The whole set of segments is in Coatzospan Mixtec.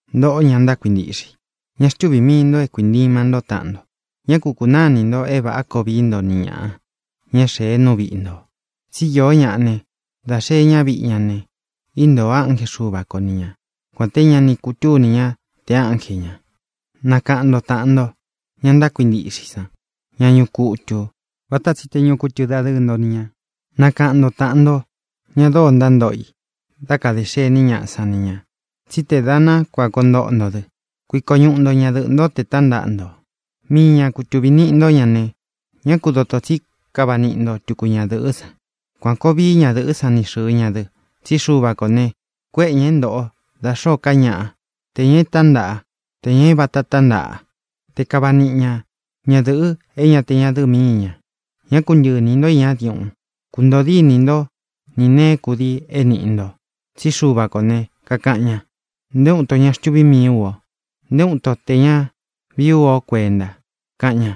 Ntōꞌó, ña ntákuintiꞌxe i, ña xtúvī mii nto é kuīnima ntó taꞌan nto. Ñá ku kūnáa inī nto é vāꞌá koo vií nto ni ñāꞌa, ña é xēe nú viꞌi ntō. Tsí iō ñáꞌa ne, da xeꞌé ña viꞌi ña ne, íntōo ánje Xuva ko ni ña, kuān té ña ni kutúni ñá te ánje ñā. Nakaꞌan nto tāꞌan nto, ña ntákuintiꞌxe i san, ñá ñuꞌu kutū, vata tsi te ñuꞌu kutu dadɨɨ nto ni ñā. Nakaꞌan nto tāꞌan nto, ña dóo ntántoꞌo i dá kadē xení ñaꞌa san ni ñā, tsí te dā ná kuān koo ntoꞌo nto dɨ. Kuiko ñuꞌu nto ñadɨꞌɨ̄ ntó tē tántaꞌa nto. Mii ña kutuvī niꞌi nto ñá ne, ñá ku dotō tsí kava niꞌi nto tuku ñadɨ̄ꞌɨ́ san. Kuan kōo vií ñadɨ̄ꞌɨ́ san ni xɨ̄ɨ ña dɨ. Tsí Xuva kō ne, kuéꞌe ñā é ntoꞌo da xōó ka ñaꞌa, te ñā e tántaꞌa, te ñā é vāta tántaꞌa, te kava niꞌi ña ñadɨ̄ꞌɨ é ñā te ñádɨ̄ꞌɨ míi ñā. Ñá ku ntɨꞌɨ inī ntó iñá diuꞌun. Kūntoo dínī ntó ni nēé kudii é nīꞌi nto. Tsí Xuva kō ne, kakaꞌan ña: “Nté uun ito ñá xtuví mii ú o. Nté uun itó tē ña vií u ó kuenta”, kaꞌan ña.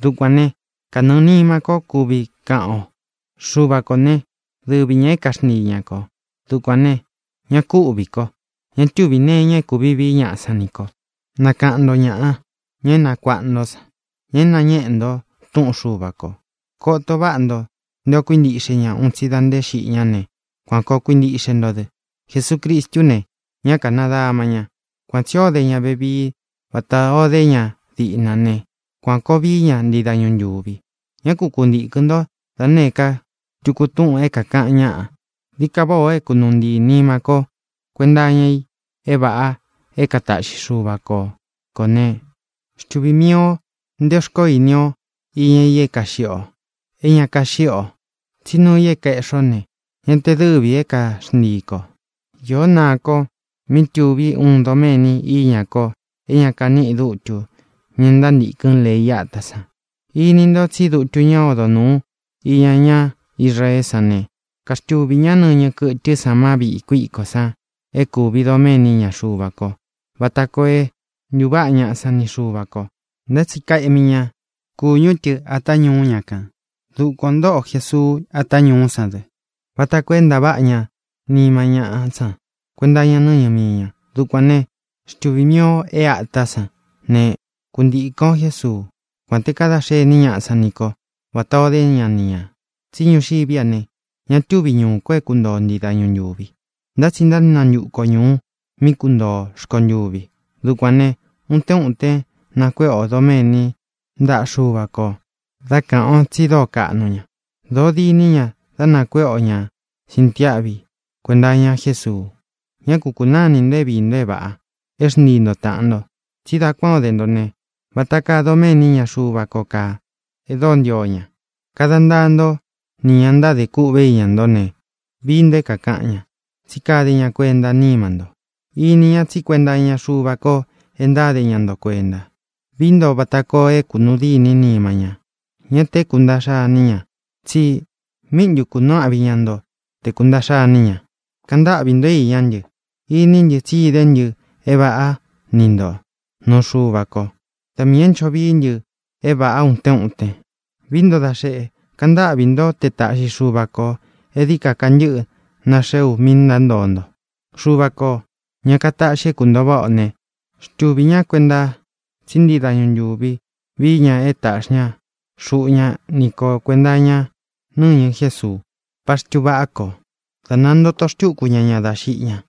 Dukuān né, kanɨɨ̄ nima ko kuvi káꞌan o: Xuva kō né, dɨvi ñā é kaxntii ñā ko. Dukuān ne, ñá ku ūꞌví ko. Ña túvī nee iña é kūvi vií ñaꞌa san ní ko. Nakaꞌan nto ñāꞌa, ña é nakuaꞌa ntó san, ña é nāñéꞌe nto túꞌun Xuva kō. Koto váꞌa nto nté ō kuíntiꞌxe ña un tsi da nté xiꞌi ñá ne, kuan kōo kuintíꞌxe nto dɨ. Jesucristú ne, ñá kānadama ña. Kuan tsī ó de ña vevii vatā o dé ña diꞌna ne, kuan kōo vií ña ntii dañu ntūvi. Ñá ku kuntīkɨn ntó da nēé ka tuku túꞌūn é kākaꞌan ñáꞌa. Dií ka váꞌā o é kunūu ntii nima ko kuenta iña i é vāꞌa é kātaꞌxi Xúva ko kō né, xtuvī mii o nté xkoó ini o iña i é kāꞌxi o, é ña káꞌxi o. Tsí nuu i é kaēꞌxi o ne, ña te dɨ́vī é kaxntii kō. Īó naa ko míꞌi tuví uun doméni iña ko é ña kaníꞌi dutu, ñá ntántīkɨn lei átā san. Ini nto tsí dutu ñá odo nūu iña ñá Israeé san ne, kaxtuvī ñá nɨñɨ kɨtɨ́ san má viꞌī kuíkó san é kūvi doméni iña Xuva ko vata koo é ntūváꞌa ñaꞌa san ni Xuva kō, ntá tsi kaeꞌmi ña kúñu tɨ āta ñuú ña kān. Dukuan ō ntóꞌo Jesuu ata ñuú san dɨ, vata koo é ntaváꞌa ña nima ñáꞌa san kuenta iña nɨ́ñɨ mii ña. Dukuān né, xtuvī mii o é ātá san ne, kuntikɨ̄n o Jésuú, kuān te kadá xení ñaꞌa san ni ko vatā o dé ña ni ñā. Tsi ñuxiví a ne, ña túvi ñuū ko é kuntoo o ntii dañu ntūvi, ntá tsi ntánantuku o ñūu mí kuntoo ō rkontuvi. Dukuān ne, utén utén nakuéꞌe ō doméni ntaꞌa Xúva kō dá kāꞌan ó tsi dóo kaꞌnu ña. Dōo diní ña dá nakuéꞌe o ñā sintiáꞌvi kuenta iña Jésuu. Ñá ku kūnáa inī nto é viī nto é vāꞌa, é xntii nto tāꞌan nto. Tsi dá kuān ó de nto ne, vata kaa doméni iña Xuva ko kaa, e dóo ntio ña. Kada ntaa ntó nī ña ntádē kûꞌvé iña ntó ne, vií ntō é kākaꞌan ñá, tsí kade ña kuentá nima nto. Ini ña tsí kuenta iña Xuva ko e ntáde ña nto kuenta. Vií nto vata koo é kunūu dîní nima ña, ñá tē é kūntaꞌxa iní ña, tsi ¿míꞌi ntu kunuu áꞌvi iña nto te kūntaꞌxa iní ña? Kaꞌan ntáꞌvī ntó iñá ntɨ. Iní ntɨ tsi idé ntɨ é vāꞌá ni ntō nuu Xuva ko. Da miī é ncho vií ntɨ é vāꞌa utén uten. Vií nto da xeꞌe, kaꞌan ntâꞌví nto te taꞌxi Xuva kō é dií ka kantɨ́ꞌɨ naxeé u míꞌī ntántoo nto. Xuva kō, ña kataꞌxi é kūntoo váꞌa ō ne, xtuvī ñá kuenta tsí ntii dañu ntūvi vií ña e táꞌxi ña xuꞌu ña ni ko kuēnta iña nɨ́ñɨ Jésuu, paxtu vaꞌá ko, dā nantóto xtūku ña ña dá xiꞌi ña.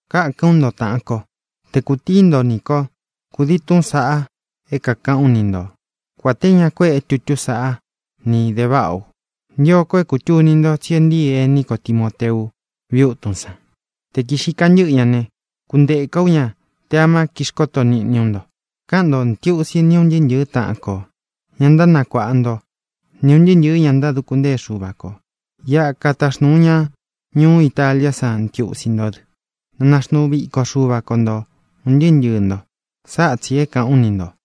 Kákān ú nto, tāꞌan kó, te kūtíi nto nī kó kudii túꞌūn saꞌa é kākaꞌán u ni nto, kuān té ña kuéꞌe tutú san ni de váꞌa u. Ntio ko é kūtuni nto tsi e ntíi ení ko Timōteu viꞌi útun san. Te kīꞌxi kantɨ́ꞌɨ ña ne, kuntēka ú ña te amá kixkoto niꞌni ú nto. Káꞌan ntō ntiusi ni ún ntɨɨ́ ntɨ̄ɨ́ taꞌan kō, ña ntánakuāꞌa nto ni ūn ntɨɨ́ ntɨ̄ɨ́ ña ntáduku ntée Xuva kō. Iꞌa kataxnūu ña ñuú Italiá san ntiusi ntó dɨ. Na naxnuu viko Xuva ko nto, ūn ntɨɨ́ ntɨɨ̄ nto. Sáꞌa tsī é kāꞌán u ni ntō.